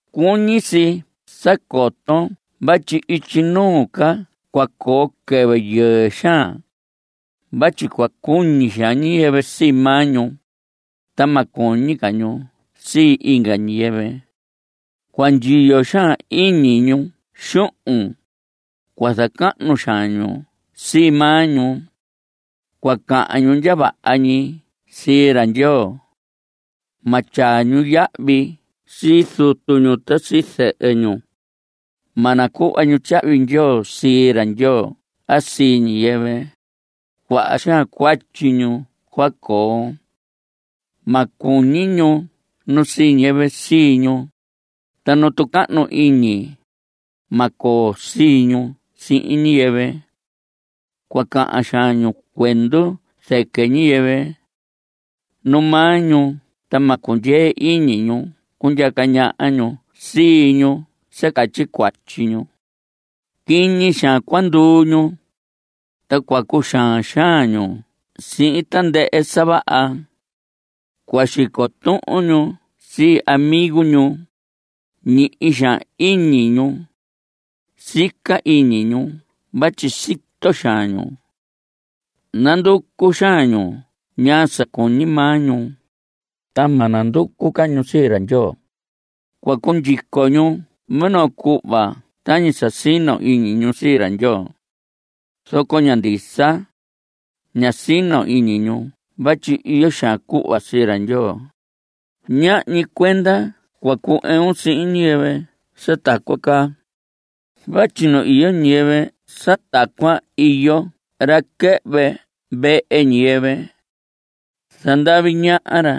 Cuñi si sa coton vatyi ityi nuu ca cua coo quɨvɨ yɨɨ xaan. Vatyi cua cuñi xaan ñiyɨvɨ sii maa ñu, ta ma cuñi ñu sii inga ñiyɨvɨ. Cua ndyiyo xaan iñi ñu xuhun. Cua zacahnu xaan ñu sii maa ñu. Cua cahan ñu ndya vaha ñi sii ra Ndyoo. Ma tyaa ñu yahvi sii zutu ñu ta sii zɨhɨ ñu. Ma nacuhva ñu tyahvi ndyoo sii ra Ndyoo a sii ñiyɨvɨ. Cuaha xaan cuatyi ñu cua coo. Ma cuñi ñu nu sii ñiyɨvɨ sii ñu. Ta nu tucahnu iñi, ma coo sii ñu sihin ñiyɨvɨ. Cua cahan xaan ñu cuendu zɨquɨ ñiyɨvɨ. Nu maa ñu ta ma cundyee iñi ñu cundyaca ñaha ñu sii ñu sa catyi cuatyi ñu. Quiñi xaan cua nanduu ñu. Ta cua cuxaan xaan ñu sii tandɨhɨ sa vaha. Cua xico tuhun ñu sii amigo ñu. Ñihi xaan iñi ñu. Sica iñi ñu vatyi sito xaan ñu. Nanducu xaan ñu ñaa sa cuñi maa ñu, ta ma nanducu ca ñu sii ra Ndyoo. Cua cundyico ñu minoo cuhva tañi sa sino iñi ñu sii ra Ndyoo, zoco ña ndisa. Ña sino iñi ñu vatyi iyo xaan cuhva sii ra Ndyoo. Ñahñi cuenda cua cu‑ɨun sihin ñiyɨvɨ sa tacuan caa. Vatyi nu iyo ñiyɨvɨ sa tacuan, iyo ra quɨhvɨ vehe ñiyɨvɨ. Zandavi ñaha ra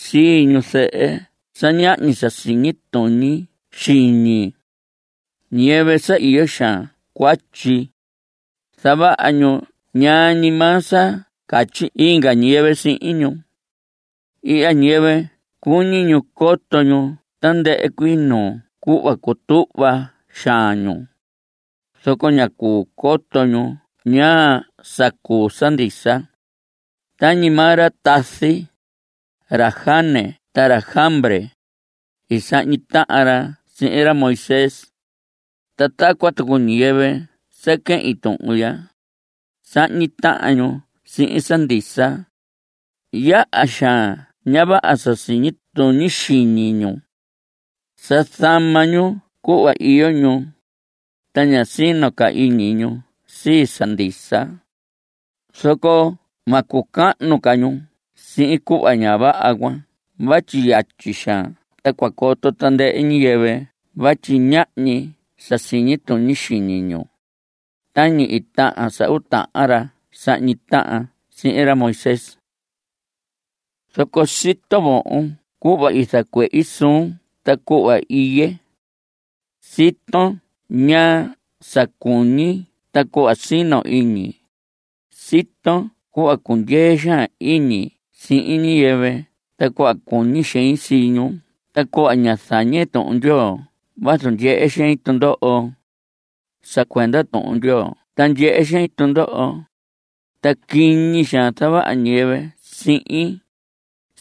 sii ñuzɨhɨ sa ñahñi sa siñi tuñi xiñi, ñiyɨvɨ sa iyo xaan cuatyi. Zavaha ñu ñaa ñi maa sa catyi inga ñiyɨvɨ sihin ñu. Ihya ñiyɨvɨ cuñi ñu coto ñu tandɨhɨ cuii nuu cuhva. Cutuhva xaan ñu, zoco ña cuu coto ñu ñaa sa cuu sa ndisa. Tañi maa ra tazi, ra Janes ta ra Jambres, i sahñi tahan ra sihin ra Moisés. Ta tacuan tucu ñiyɨvɨ sa quehin tuhun ya, sahñi tahan ñu sihin sa ndisa. Yaha xaan ña vaha sa siñi tuñi xiñi ñu. Sa zama ñu cuhva iyo ñu, ta ña sino ca iñi ñu sii sa ndisa. Zoco ma cucahnu ca ñu sihin cuhva ña vaha cuan vatyi yatyi xaan ta cua coto tandɨhɨ ñiyɨvɨ vatyi ñahñi sa siñi tuñi xiñi ñu. Tañi i tahan sa uu tahan ra sahñi tahan sihin ra Moisés. Zoco sito vohon cuhva i zacuehi suun ta cuhva iye. Siton ñaa sa cuñi ta cuhva sino iñi. Siton cuhva cundyee xaan iñi sihin ñiyɨvɨ ta cuhva cuñi xein sii ñu ta cuhva ña zañe Tuhun Ndyoo vazu ndyehe xein tundoho. Sa cuenda Tuhun Ndyoo ta ndyehe xein tundoho, ta quiñi xaan zavaha ñiyɨvɨ sihin.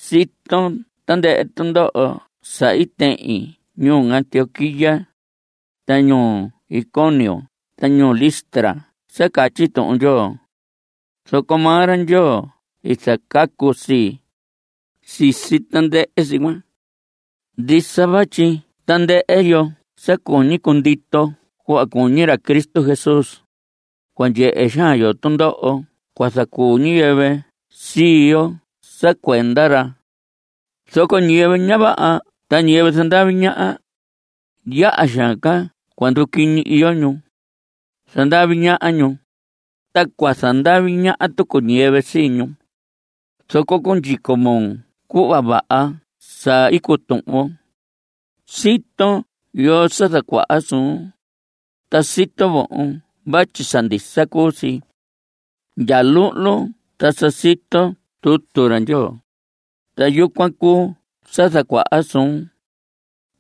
Siton tandɨhɨ tundoho sa i tehin ñuu Antioquía, ta ñuu Iconio ta ñuu Listra sa catyi Tuhun Ndyoo. Zoco maa ra Ndyoo i zacacu sii, sisi tandɨhɨ si cuan. Ndisa vatyi tandɨhɨ yo sa cuñi cundito cuhva cuñi ra Cristo Jesús, cua ndyehe xaan yo tundoho cua zacuu ñiyɨvɨ sii yo sa cuenda ra. Zoco ñiyɨvɨ ña vaha ta ñiyɨvɨ zandavi ñaha, yaha xaan ca cua nduquiñi iyo ñu. Zandavi ñaha ñu, ta cua zandavi ñaha tucu ñiyɨvɨ sii ñu. Zoco cundyico moo cuhva vaha sa i cutuhvon. Siton yoo sa zacuaha suun, ta sito vohon vatyi sa ndisa cuu si. Ndya luhlun ta sa siton tutu ra Ndyoo, ta yucuan cuu sa zacuaha suun.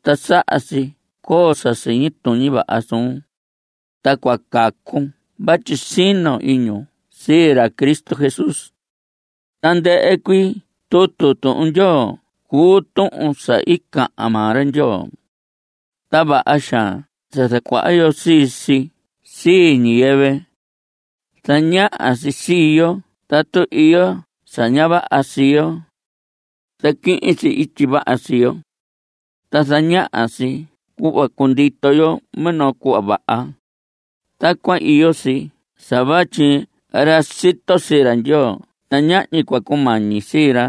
Ta saha si coo sa siñi tuñi vaha suun. Ta cua cacun vatyi sino iñun sii ra Cristo Jesús. Tandɨhɨ cuii tutu Tuhun Ndyoo cuu tuhun sa i cahan maa ra Ndyoo. Ta vaha xaan sa zacuaha yo sii si sii ñiyɨvɨ. Zañaha si sii yo tatu iyo sa ña vaha sii yo. Zaquihin si ityi vaha sii yo. Ta zañaha si cuhva cundito yo minoo cuhva vaha. Tacuan iyo si sa vatyi ra sito sii ra Ndyoo ta ñahñi cua cumañi sii ra.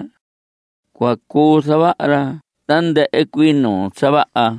Cua cuu zavaha ra tandɨhɨ cuii nuu sa vaha.